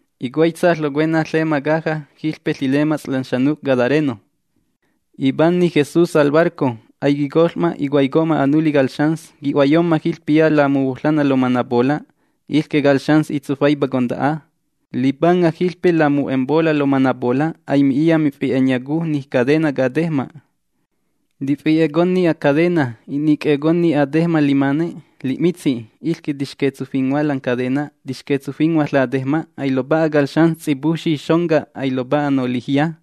Icuaitsa ƚocuena ƚema caja jiƚpe ƚilemats' lan xanuc' gadareno. Ipanni Jesús al barco. Aiquicoƚ'ma, icuaico'ma anuli cal xans qui'huayomma jiƚpiya lamuhuoƚanna lomanapola'. Iƚque cal xans ƚitsufaipa conta'a. Lipanga jiƚpe lamu'empola' lomanapola'. Aimi'iya mifi'enyacu ni cadena catejma'. Tifi'econni acadena, inic'e'econni atejma' limane li'mitsi'. Iƚque tits'aƚquinghua lan cadena, tixquetsufinghua latejma'. Ailopa'a cal xans ts'ipujfxi xonca. Ailopa'a nolijya.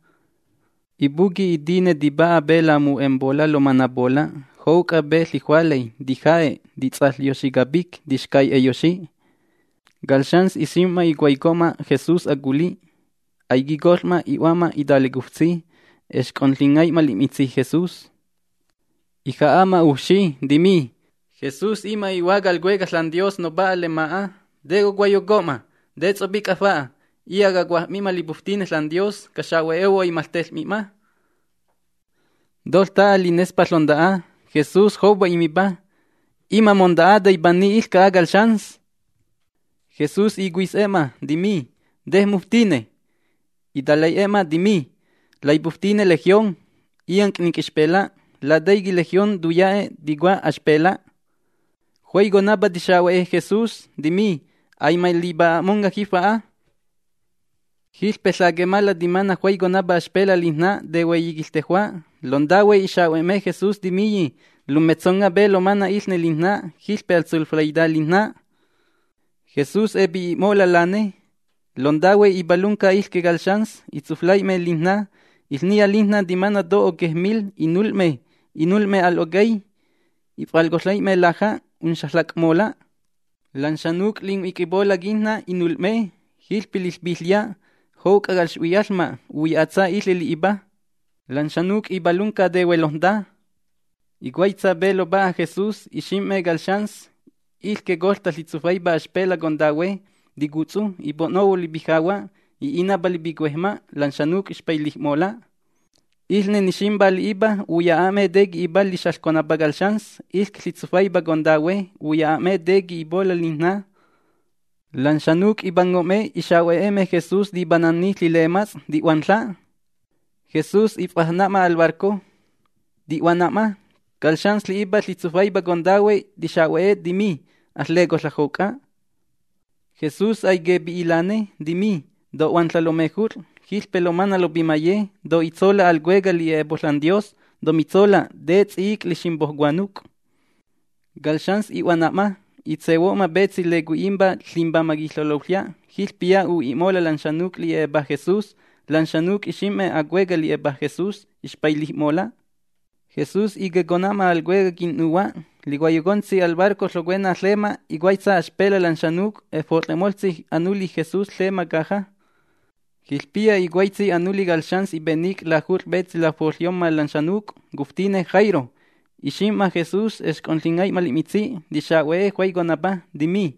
Ipuqui' itine tipa'a pe lamu'empola' lomanapola', jouc'a pe ƚijualay, tija'e', tits'aƚyoxi capic, tixcai'eyoxi. Cal xans ixim'ma icuaico'ma Jesús aculi'. Aiquicoƚ'ma, i'hua'ma italecuftsi, exc'onƚingai'ma li'mitsi' Jesús. Ija'a'ma ujfxi, timi: ―Jesús, ima' i'Hua cal Cuecaj ȽanDios Nopa'a lema'a, ¿te cocuaiyoco'ma? ¿Te ts'opic'a fa'a? Iya' cacuaj'mi'ma lipuftine ȽanDios, caxa'huehuo' aimaƚteƚ'mi'ma. Toƚta'a linespa ƚonta'a. Jesús joupa imipa: ―¡Ima' monta'a, taipanni iƚca'a cal xans! Jesús icuis'e'ma, timi: ―¿Te muftine? Italai'e'e'ma, timi: ―Laipuftine Legión. Illanc' ninc'xpela'. (Lataiqui' “legión” tuya'e', ticua: Axpela'.) Juaiconapa tixa'hue Jesús, timi: ―Aimalipa'a'monga' jifa'a. Jiƚpe ƚaquemala timana' juaiconapa axpela' lijná tehueyi quiƚtejua'. Lontahue ixahue'me Jesús, timiyi: ―Lummetsonga' pe lomana' iƚne lijná. Jiƚpe aƚtsuflaita lijná. Jesús epi'i'mola' lane. Lontahue ipalunca iƚque cal xans, itsuflai'me lijná. Iƚniya lijná timana' to oquej mil. Inul'me, imul'me al'ocay. If'alcoƚai'me laja'. Unxaƚac'mola'. Lan xanuc' linhuic'ipola' quijná inul'me. Jiƚpe liƚpiƚya' jouc'a calx'huiyaƚma' uya'atsa iƚe' li'ipa. Lan xanuc' ipalunca tehuelojnta. Icuaitsa pe lopa'a Jesús, ixim'me cal xans, iƚque coƚta ƚitsufaipa axpela' contahue, ticutsu, ipo'nohuo lipijahua', i'inapa lipicuejma'. Lan xanuc' ixpailij'mola'. Iƚne niximpá li'ipa uya'a'me te qui'ipa lixaƚconapa cal xans, iƚque ƚitsufaipa contahue. Uya'a'me te qui'ipola' lijná. Lan xanuc' ipango'me ixa'hue'me Jesús tipanni ƚilemats', ti'huanƚa'. Jesús if'ajna'ma al barco, ti'huana'ma. Cal xans li'ipa ƚitsufaipa contahue tixa'hue, timi: ―Aƚƚecoƚa' jouc'a. Jesús aiquepi'i' lane. Timi: ―To'huanƚa' lomejut'ƚ, jiƚpe lomana' lopimaye. To'itsola' al cueca' li'e'epo' ȽanDios. Tomitsola' te ts'i'ic' liximpo' cuanuc'. Cal xans i'huana'ma, itsehuo'ma petsi lecui'impa: Limbamaj Quiƚeloƚya'. Jiƚpiya u'i'mola' lan xanuc' li'e'epa Jesús. Lan xanuc' ixim'me acueca' li'epa Jesús, ixpailij'mola'. Jesús iquiecona'ma al cuecaj quin'nuhua'. Licuaiyocontsi al barco ƚocuena ƚema, icuaitsa axpela' lan xanuc', efot'ƚe'moƚtsi anuli Jesús ƚema caja. Jiƚpiya icuaitsi anuli cal xans ipenic' lajut'ƚ pe lafoƚyomma lan xanuc'. Cuftine Jairo. Lixim'ma Jesús, exc'onƚingai'ma li'mitsi', tixa'hue juaiconapa, timi: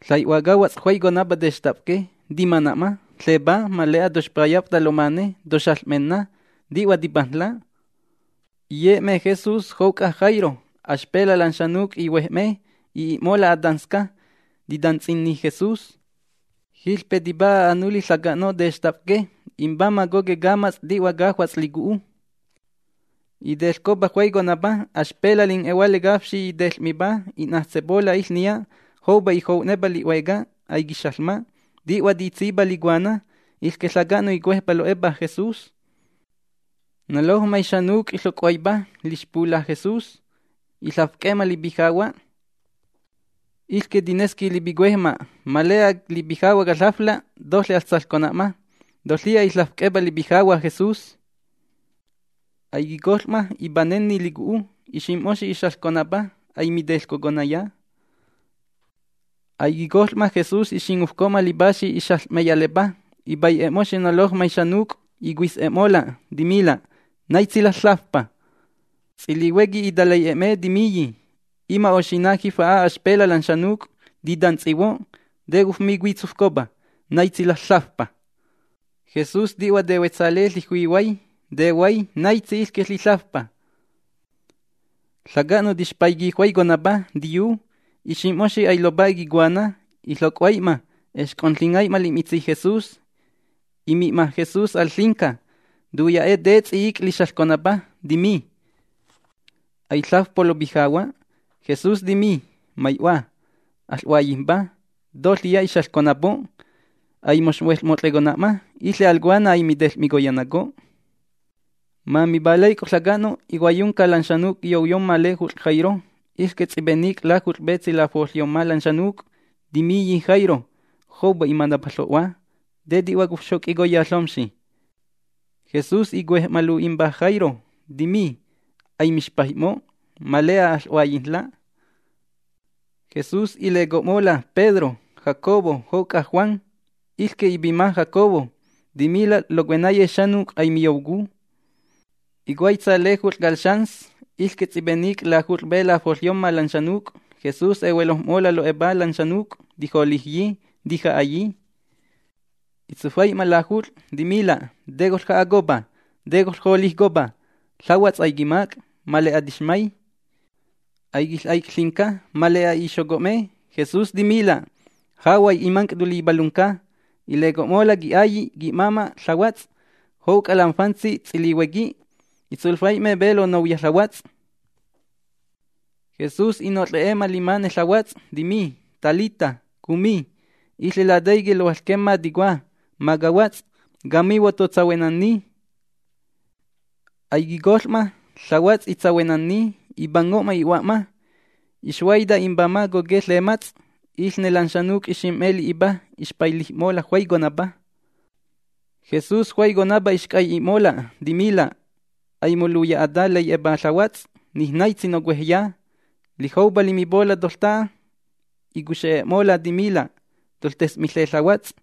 ―Ƚai'hua cahuats' juaiconapa textafque. Timana'ma. Ƚepá. Ma le'a toxpayaf'ta lomane, toxaƚ'menna, ti'hua tipajnla'. Iye'me Jesús jouc'a Jairo. Axpela' lan xanuc' ihuej'me. I'i'mola' atansca, titantsinni Jesús. Jiƚpe tipa'a anuli ƚaca'no' textafque. Imbamaj coque' camats' ti'hua cajuats' licu'u. Iteƚcopa juaiconapa. Axpela' lin'e'ehuale cafxi iteƚ'mipá. I'najtsepola' iƚniya, joupa ijou'nenapa li'hueca. Aiquixaƚma. Ti'hua titsípa licuana. Iƚque ƚaca'no' icuejpa lo'epa Jesús. Nolojmay xanuc' iƚoc'huaipa lixpula' Jesús. Iƚafc'e'e'ma lipijahua'. Iƚque tinesqui lipicuejma': “Ma le'a lipijahua' caƚafla', toƚe aƚsaƚcona'ma”. Tot'ƚiya iƚafc'e'epa lipijahua' Jesús. Aiquicoƚ'ma, ipanenni licu'u. Ixim'moxi ixaƚconapa. Aimiteƚcoconaya. Aiquicoƚ'ma, Jesús ixingufco'ma lipaxi ixaƚ'meyalepa. Ipai'e'moxi nolojmay xanuc', icuis'e'mola', timila': ―¿Naitsi ƚaƚ―lafpa? Ts'ilihuequi italai'e'e'me, timiyi: ―Ima' oxina' jifa'a axpela' lan xanuc' titantsihuo', ¿te cofmicuitsufcopa: “¿Naitsi ƚaƚ―lafpa?”? Jesús ti'hua tehuetsale ƚijuihuay. Tehuay naitsi iƚque ƚiƚafpa. Ƚaca'no' tixpaiqui juaiconapa, tiyu, iximpoxi ailopa'a quicuana. Iƚoc'huai'ma, exc'onƚingai'ma li'mitsi' Jesús. Imi'ma Jesús al ƚinca. Tuya'e' te ts'i'ic' lixaƚconapa, timi: ―Aiƚafpo' lopijahua'. Jesús timi: ―Mai'hua, aƚ'huaiyijmpa, toƚiya ixaƚconapo'. Aimoxhueƚmot'ƚe'ma. Iƚe al cuana aimiteƚ'miconayaco'. Ma mipalaic'o ƚaca'no', icuaiyunca lan xanuc' quiyouyomma lejut'ƚ Jairo, iƚque ts'ipenic' lajut'ƚ pe lafoƚyomma lan xanuc'. Timiyi Jairo: ―Joupa imanapa ƚo'hua. ¿Te ti'hua cofxoc'icoya ƚomxi? Jesús icuej'ma lu'impa Jairo. Timi: ―Aimixpaij'mo'. Ma le'a aƚ'huaiyijnla'. Jesús ileco'mola' Pedro, Jacobo, jouc'a Juan, iƚque ipima Jacobo. Timila' locuenaye xanuc' aimiyoucu. Icuaitsa lejut'ƚ cal xans, iƚque ts'ipenic' lajut'ƚ pe lafoƚyomma lan xanuc', Jesús ehuelojm'mola' lo'epa lan xanuc', tijolijyi, tija'ayi. Itsufai'ma lajut'ƚ, timila': ―¿Te coƚja'acopa? ¿Te coƚjolijcopa? Ƚahuats' aiquimac', ma le'a tixmay. Aiquiƚ'aic' ƚinca. Ma le'a ixoco'me. Jesús timila': ―Jahuay imanc' tolipalunca. Ileco'mola' qui'ailli', qui'máma' ƚahuats', jouc'a lam fantsi ts'ilihuequi. Itsuflai'me pe lonouya ƚahuats'. Jesús i'noƚ'e'e'ma limane ƚahuats', timi: ―Talitá kumi. (Iƚe lataiqui' lohuaƚquemma ticua: Macahuats', camihuo', totsahuenni.) Aiquicoƚ'ma, ƚahuats' itsahuenanni, ipango'ma i'hua'ma. Ixhuaita imbamaj coquej ƚemats'. Iƚne lan xanuc' lixim'me li'ipa ixpailij'mola' juaiconapa. Jesús juaiconapa ixc'ai'i'mola', timila': ―Aimoluya'ata lai'e'epa ƚahuats'. Nij naitsi nocuejya. Lijoupa limipola' toƚta'a, icuxe'e'mola', timila': ―Toƚtes'miƚe ƚahuats'.